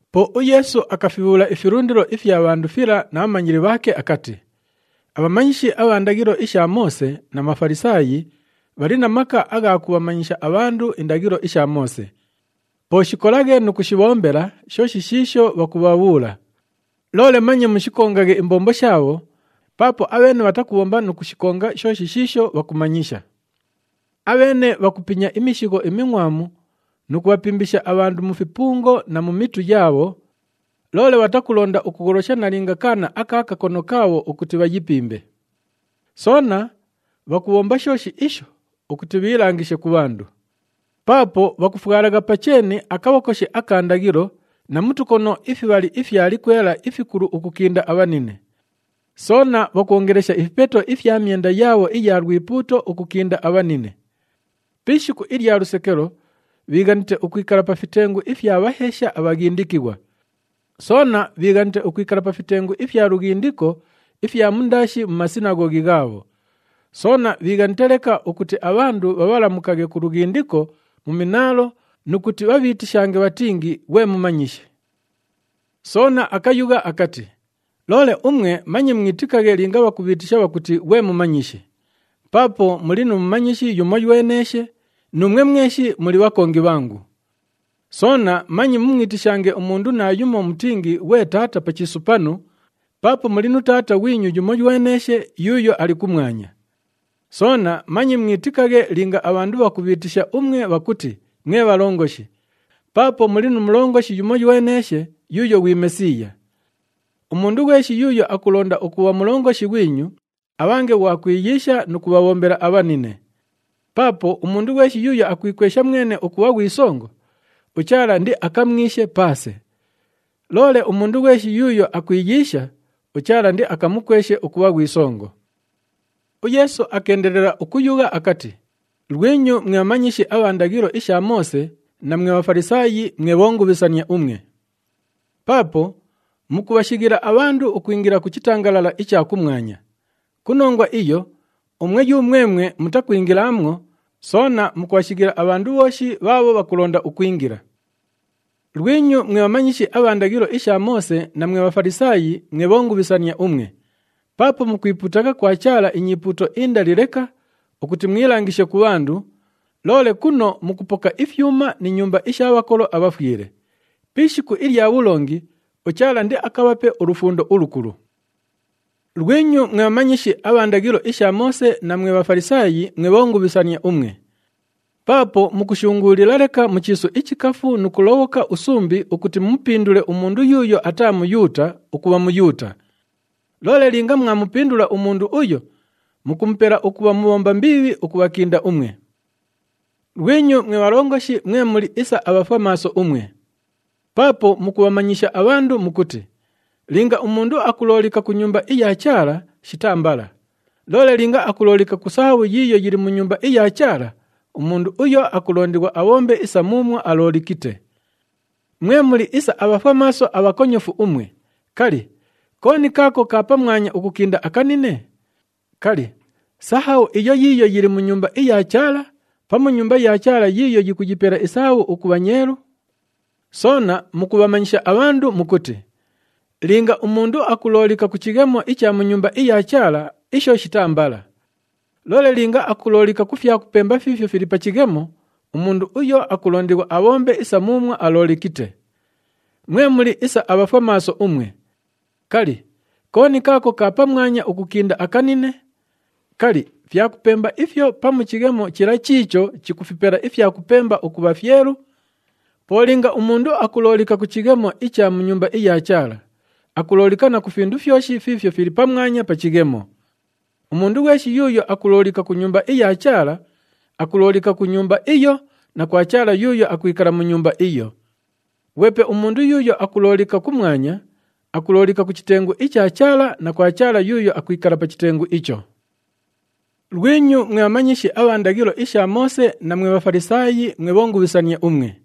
Po uYeesu akafibhuula ifilundilo ifya bhandu fila na bhamanyili bhaake akati, “Abhamanyishi abha ndaghilo isha Moose na Bhafalisaayi bhali na maka agha kubhamanyisha abhandu indaghilo isha Moose. Po shikolaghe nu kushibhombela shooshi shiisho bhakubhabhuula. Loole manye mushikongaghe imbombo shaabho, paapo abheene bhatakubhomba nu kushikonga shooshi shiisho bhakumanyisha. Abheene bhakupinya imishigho imingʼwamu nu kubhapimbisha abhandu mu fipungo na mu mitu yaabho, loole bhatakulonda ukugholosha nalinga kaana aka kakono kaabho ukuti bhayipimbe. Soona bhakubhomba shooshi isho ukuti bhiilangishe ku bhandu. Paapo bhakufwalagha pa cheeni akabhokoshi aka ndaghilo na mu tukono ifibhali ifya likwela ifikulu ukukinda abhanine. Soona bhakwongelesha ifipeto ifya myenda yaabho iya lwipuuto ukukinda abhanine. Pi ishiku ilya lusekelo, bhiighanite ukwikala pa fitengu ifya bhaheesha abhaghindikighwa. Soona bhiighanite ukwikala pa fitengu ifya lughindiko ifya mundaashi mu masinaghoghi ghaabho. Soona bhiighanite leka ukuti abhandu bhabhalamukaghe ku lughindiko mu minaalo nu kuti bhabhiitishange bhatingi, ‘Ghwe Mumanyishi.’” Soona akayugha akati, “Loole umwe manye mwitikaghe linga bhakubhiitisha bhakuti, ‘Ghwe Mumanyishi!’ Paapo muli nu mumanyishi yumoyweneeshe nuumwe mweshi muli bhakongi bhangu. Soona manye mumwitishange umundu naayumo mutingi, ‘Ghwe taata’ pa chiisu panu, paapo muli nu Taata ghwinyu yumoyweneeshe yuuyo ali kumwanya. Soona manye mwitikaghe linga abhandu bhakubhiitisha umwe bhakuti, ‘Mwe bhalongoshi,’ paapo muli nu Mulongoshi yumoyweneeshe yuuyo ghwi Mesiiya. Umundu ghweshi yuuyo akulonda ukubha mulongoshi ghwinyu, abhange ghwa kwiyiisha nu kubhabhombela abhanine. Paapo umundu ghweshi yuuyo akwikwesha mwene ukubha ghwi songo, uChaala indiakamwishe paase. Loole umundu ghweshi yuuyo akwiyiisha, uChaala indiakamukweshe ukubha ghwi songo.” UYeesu akeendelela ukuyugha akati, “Lwinyu mwe bhamanyishi abha ndaghilo isha Moose na mwe Bhafalisaayi, mwe bhongubhisania umwe! Paapo mukubhashighila abhandu ukwingila ku chitangalala icha kumwanya. Ku nongwa iyo umwe yumwemwe mutakwingilaamwo, soona mukubhashighila abhandu bhooshi bhaabho bhakulonda ukwingila. [ “Lwinyu mwe bhamanyishi abha ndaghilo isha Moose na mwe Bhafalisaayi, mwe bhongubhisania umwe! Paapo mukwipuutagha kwa Chaala inyipuuto indali leka ukuti mwilangishe ku bhandu, loole kuno mukupoka ifyuma ni nyumba isha bhakolo abhafwile. Pi ishiku ilya bhulongi, uChaala indiakabhape ulufundo ulukulu.] “Lwinyu mwe bhamanyishi abha ndaghilo isha Moose na mwe Bhafalisaayi, mwe bhongubhisania umwe! Paapo mukushunguulila leka mu chiisu ichikafu nu kulobhoka usumbi ukuti mumupindule umundu yuuyo ataa Muyuuta ukubha Muyuuta. Loole linga mwamupindula umundu uyo, mukumupela ukubha mubhomba mbiibhi ukubhakinda umwe. “Lwinyu mwe bhalongoshi mwe muli isa abhafwamaaso umwe! Paapo mukubhamanyisha abhandu mukuti, ‘Linga umundu akuloolika ku Nyumba iya Chaala, shitaa mbala. Loole linga akuloolika ku sahabhu yiiyo yili mu Nyumba iya Chaala, umundu uyu akulondighwa abhombe isa muumwo aloolikite.’ Mwe muli isa abhafwamaaso abhakonyofu umwe! Kali, kooni kaako ka pamwanya ukukinda akanine? Kali, sahabhu iyo yiiyo yili mu Nyumba iya Chaala, pamu Nyumba ya Chaala yiiyo yikuyipela isahabhu ukubha nyeelu? Soona mukubhamanyisha abhandu mukuti, ‘Linga umundu akuloolika ku chighemo icha mu Nyumba iya Chaala, isho shitaa mbala. Loole linga akuloolika ku fyakupemba fiifyo fili pa chighemo, umundu uyo akulondighwa abhombe isa muumwo aloolikite.’ Mwe muli isa abhafwamaaso umwe! Kali, kooni kaako ka pamwanya ukukinda akanine? Kali, fyakupemba ifyo pamu chighemo chila chiicho chikufipela ifyakupemba ukubha fyelu? Po linga umundu akuloolika ku chighemo icha mu Nyumba iya Chaala, akuloolika na ku findu fyoshi fiifyo fili pamwanya pa chighemo. Umundu ghweshi yuuyo akuloolika ku Nyumba iya Chaala, akuloolika ku Nyumba iyo na kwa Chaala yuuyo akwikala mu Nyumba iyo. Ghwepe umundu yuuyo akuloolika kumwanya, akuloolika ku chitengu icha Chaala na kwa Chaala yuuyo akwikala pa chitengu icho. “Lwinyu mwe bhamanyishi abha ndaghilo isha Moose na mwe Bhafalisaayi, mwe bhongubhisania umwe!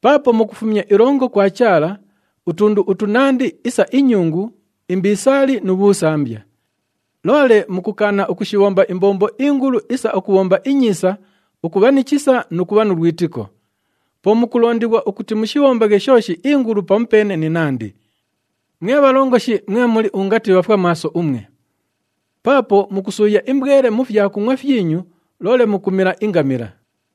Paapo mukufumya ilongo kwa Chaala utundu utunandi isa inyungu, imbisaali nu bhuusambiya. Loole mukukaana ukushibhomba imbombo ingulu isa ukubhomba inyiisa, ukubha ni chisa nu kubha nu lwitiko. Po mukulondighwa ukuti mushibhombaghe shooshi ingulu pamupeene ni nandi. Mwe bhalongoshi mwe muli ungati bhafwamaaso umwe! Paapo mukusuuya imbwele mu fyakungʼwa fyinyu, loole mukumila ingamila!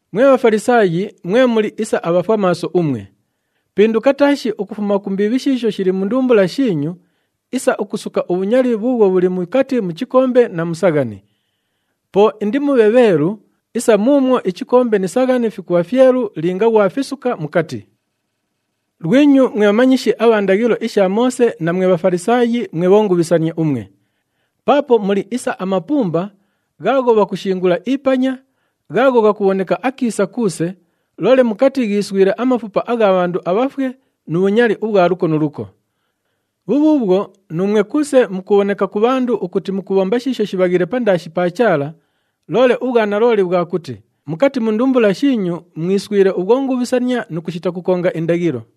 Mwe Bhafalisaayi, mwe muli isa abhafwamaaso umwe! Pinduka taashi ukufuma ku mbiibhi shiisho shili mu ndumbula shiinyu isa ukusuka ubhunyali bhuubhwo bhuli mukati mu chikombe na mu saghani. Po indimubhe bheelu isa muumwo ichikombe ni saghani fikubha fyelu linga ghwafisuka mukati. “Lwinyu mwe bhamanyishi abha ndaghilo isha Moose na mwe Bhafalisaayi, mwe bhongubhisania umwe! Paapo muli isa amapumba ghaagho bhakushingula ipanya, ghaagho ghakubhoneka akiisa kuuse, loole mukati ghiiswile amafupa agha bhandu abhafwe nu bhunyali ubhwa luko nu luko. Bhubhuubhwo, nuumwe kuuse mukubhoneka ku bhandu ukuti mukubhomba shiisho shibhaghiile pandaashi pa Chaala, loole ubhwanalooli bhwa kuti mukati mu ndumbula shiinyu mwiswile ubhwongubhisania nu kushita kukonga indaghilo.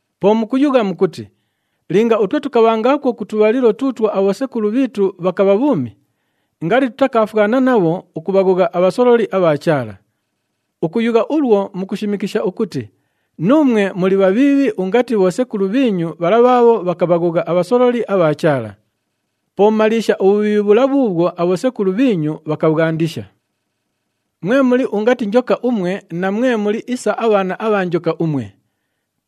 Po mukuyugha mukuti, ‘Linga utwe tukabhangaakwo ku tubhalilo tuutwo abhosekulu bhiitu bhakabha bhuumi, ngali tutakaafwana nabho ukubhaghogha abhasololi abha Chaala.’ Ukuyugha ulwo, mukushimikisha ukuti nuumwe muli bhabhiibhi ungati bhosekulu bhiinyu bhala bhaabho bhakabhaghogha abhasololi abha Chaala! Po maliisha ubhubhiibhi bhula bhuubhwo abhosekulu bhiinyu bhakabhwandisha! “Mwe muli ungati njoka umwe na mwe muli isa abhaana abha njoka umwe!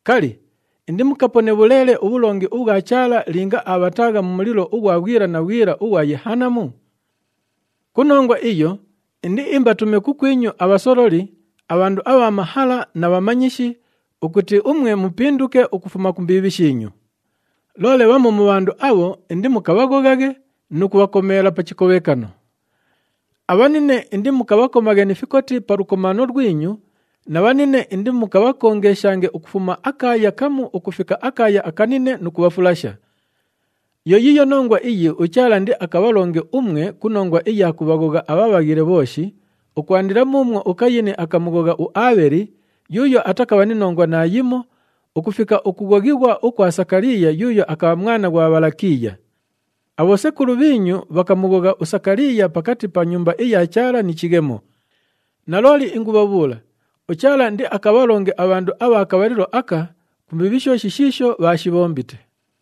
Kali, indimukapone bhuleele ubhulongi ubhwa Chaala linga abhataagha mu mulilo ughwa bhwila na bhwila ughwa Yehanamu? Ku nongwa iyo indiimbatume kukwinyu abhasololi, abhandu abha mahala na bhamanyishi ukuti umwe mupinduke ukufuma ku mbiibhi shiinyu. Loole bhamu mu bhandu abho, indimukabhaghoghaghe nu kubhakomeela pa chikobhekano. Abhanine indimukabhakomaghe ni fikoti pa lukomaano lwinyu na bhanine indimukabhakongeshange ukufuma akaaya kamu ukufika akaaya akanine nu kubhafulasha. Yo yiiyo nongwa iyi uChaala indiakabhalonge umwe ku nongwa iya kubhaghogha abhabhaghile bhooshi, ukwandila muumwo uKayini akamughogha uAabheli yuuyo atakabha ni nongwa naayimo ukufika ukughoghighwa ukwa Sakaliiya yuuyo akabha mwana ghwa Bhalakiiya. Abhosekulu bhiinyu bhakamughogha uSakaliiya pakati pa Nyumba iya Chaala ni chighemo. Nalooli ingubhabhuula uChaala indiakabhalonge abhandu abha kabhalilo aka ku mbiibhi shooshi shiisho bhaashibhombite.”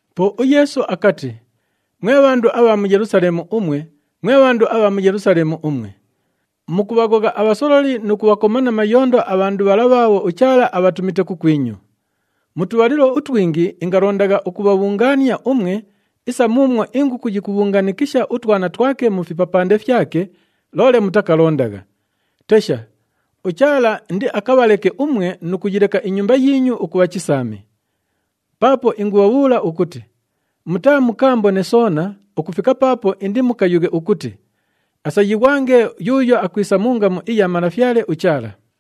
Po uYeesu akati, “Mwe bhandu abha mu Yelusaleemu umwe, mwe bhandu abha mu Yelusaleemu umwe! Mukubhaghogha abhasololi nu kubhakoma na mayondo abhandu bhala bhaabho uChaala abhatumite kukwinyu. Mu tubhalilo utwingi ingalondagha ukubhabhungaania umwe isa muumwo inguku yikubhungaanikisha utwana twake mu fipapande fyake, loole mutakalondagha! Tesha, uChaala indiakabhaleke umwe nu kuyileka inyumba yiinyu ukubha chisaami. Paapo ingubhabhuula ukuti mutaamukaambone soona ukufika paapo indimukayughe ukuti, ‘Asayighwange yuuyo akwisa mu ngamu iya Malafyale uChaala!’”